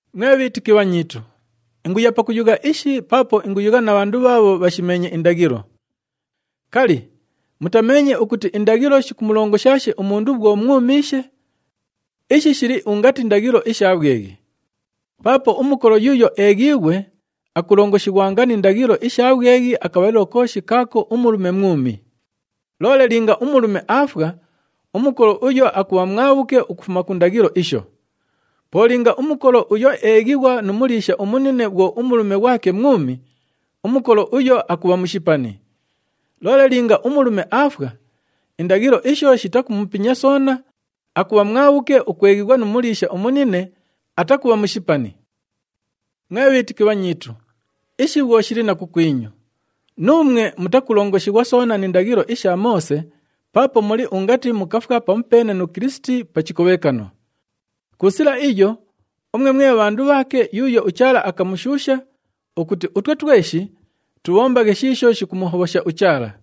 Mwe bhiitiki bhanyiitu, inguya pakuyugha ishi paapo inguyugha na bhandu bhaabho bhashimeenye indaghilo. Kali, mutameenye ukuti indaghilo shikumulongoshaashe umundu bhwo mwumiishe? Ishi shili ungati ndaghilo isha bhweghi. Paapo umukolo yuuyo eeghiighwe, akulongoshighwanga ni ndaghilo isha bhweghi akabhalilo kooshi kaako umulume mwumi. Loole linga umulume aafwa, umukolo uyo akubha mwabhuke ukufuma ku ndaghilo isho. Po linga umukolo uyo eeghighwa nu muliisha umunine bhwo umulume ghwake mwumi, umukolo uyo akubha mushipani. Loole linga umulume aafwa, indaghilo isho shitakumupinya soona, akubha mwabhuke ukweghighwa nu muliisha umunine, atakubha mushipani. Mwe bhiitiki bhanyiitu, ishi bhwo shili na kukwinyu. Nuumwe mutakulongoshighwa soona ni ndaghilo isha Moose paapo muli ungati mukafwa pamupeene nu Kilisiti pa chikobhekano. Ku sila iyo, umwe mwe bhandu bhaake yuuyo uChaala akamushuusha ukuti utwe tweshi tubhombaghe shiisho shikumuhobhosha uChaala.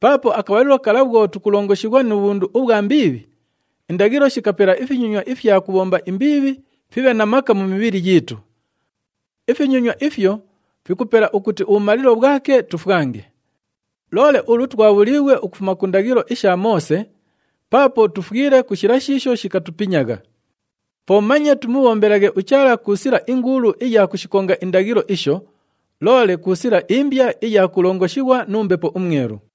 Paapo akabhalilo kala bhwo tukulongoshighwa nu bhundu ubhwa mbiibhi, indaghilo shikapela ifinyonywa ifya kubhomba imbiibhi fibhe na maka mu mibhili yiitu. Ifinyonywa ifyo fikupela ukuti ubhumalilo bhwake tufwange. Loole ulu twabhuliighwe ukufuma ku ndaghilo isha Moose, paapo tufwile ku shila shiisho shikatupinyagha. Po manye tumubhombelaghe uChaala ku sila inguulu iya kushikonga indaghilo isho, loole ku sila imbya iya kulongoshighwa nu Mbepo uMwelu.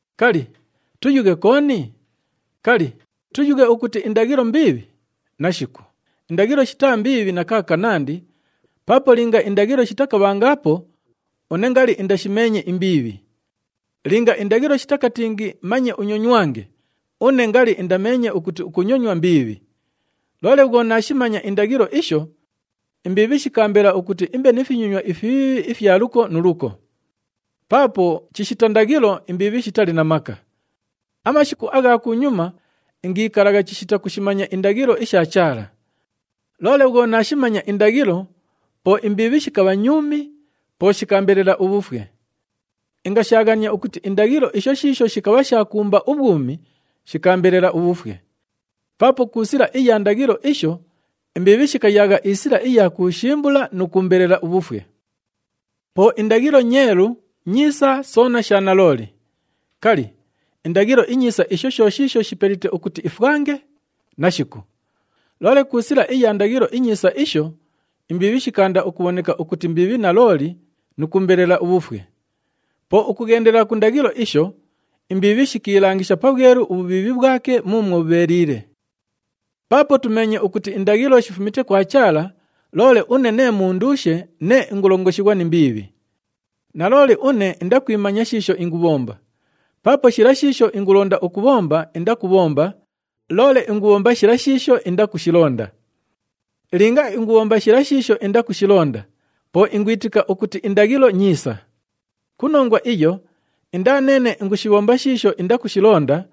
Kali, tuyughe kooni? Kali, tuyughe ukuti indaghilo mbiibhi? Nashiku, indaghilo shitaa mbiibhi na kaakanandi paapo linga indaghilo shitakabhangaapo, une ngali indashimeenye imbiibhi. Linga indaghilo shitakatingi, “Manye unyonywange,” une ngali indameenye ukuti ukunyonywa mbiibhi. Loole bhwo naashimanya indaghilo isho, imbiibhi shikaambela ukuti imbe ni finyonywa ifibhiibhi ifya luko nu luko. Paapo chishita ndaghilo, imbiibhi shitali na maka. Amashiku agha kunyuma ingikalagha chishita kushimanya indaghilo isha Chaala. Loole bhwo naashimanya indaghilo, po imbiibhi shikabha nyuumi, po shikaambelela ubhufwe. Ingashaaghania ukuti indaghilo isho shiisho shikabha sha kuumba ubhwumi, shikaambelela ubhufwe. Paapo ku sila iya ndaghilo isho, imbiibhi shikayaagha isila iya kuushimbula nu kuumbelela ubhufwe. Po indaghilo nyeelu, nyiisa soona sha nalooli. Kali, indaghilo inyiisa isho sho shiisho shipelite ukuti ifwange? Nashiku! Loole ku sila iya ndaghilo inyiisa isho, imbiibhi shikaanda ukubhoneka ukuti mbiibhi nalooli nu kuumbelela ubhufwe. Po ukughendela ku ndaghilo isho, imbiibhi shikiilangisha pabhwelu ubhubhiibhi bhwake muumwo bhubheeliile. Paapo tumeenye ukuti indaghilo shifumite kwa Chaala, loole une nee munduushe, nee ingulongoshighwa ni mbiibhi. Nalooli une indakwimanya shiisho ingubhomba, paapo shila shiisho ingulonda ukubhomba, indakubhomba, loole ingubhomba shila shiisho indakushilonda. Linga ingubhomba shila shiisho indakushilonda, po ingwitika ukuti indaghilo nyiisa. Ku nongwa iyo, indaa neene ingushibhomba shiisho indakushilonda,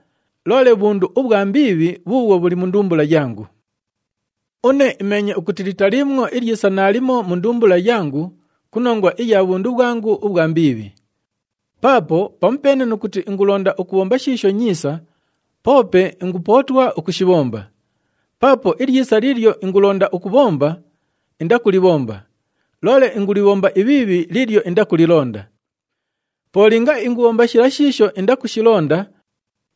loole bhundu ubhwa mbiibhi bhuubhwo bhuli mu ndumbula yangu. Une imeenye ukuti litaliimwo ilyisa naalimo mu ndumbula yangu ku nongwa iya bhundu bhwangu ubhwa mbiibhi. Paapo pamupeene nu kuti ingulonda ukubhomba shiisho nyiisa, poope ingupootwa ukushibhomba. Paapo ilyisa liilyo ingulonda ukubhomba, indakulibhomba, loole ingulibhomba ibhiibhi liilyo indakulilonda. Po linga ingubhomba shila shiisho indakushilonda,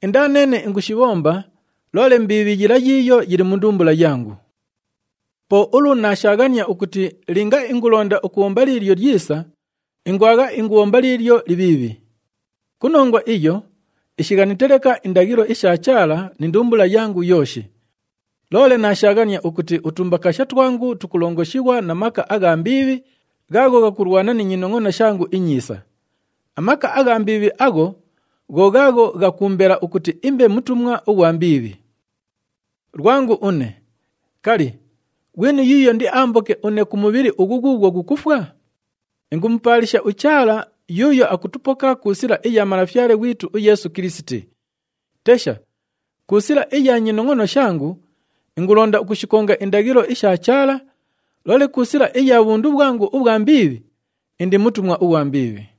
indaa neene ingushibhomba, loole mbiibhi yila yiiyo yili mu ndumbula yangu. Po ulu naashaaghania ukuti linga ingulonda ukubhomba liilyo lyisa, ingwagha ingubhomba liilyo libhiibhi. Ku nongwa iyo, ishighanite leka indaghilo isha Chaala ni ndumbula yangu yooshi. Loole naashaaghania ukuti utumbakaasha twangu tukulongoshighwa na maka agha mbiibhi, ghaagho ghakulwana ni nyinongʼono shangu inyiisa. Amaka agha mbiibhi agho gho ghaagho ghakuumbela ukuti imbe mutumwa ughwa mbiibhi. Lwangu une! Kali, ghwini yuuyo indiaamboke une ku mubhili ughu ghuughwo ghukufwa? Ingumupaalisha uChaala, yuuyo akutupoka ku sila iya Malafyale ghwitu uYeesu Kilisiti! Tesha! Ku sila iya nyinongʼono shangu, ingulonda ukushikonga indaghilo isha Chaala, loole ku sila iya bhundu bhwangu ubhwa mbiibhi, indi mutumwa ughwa mbiibhi.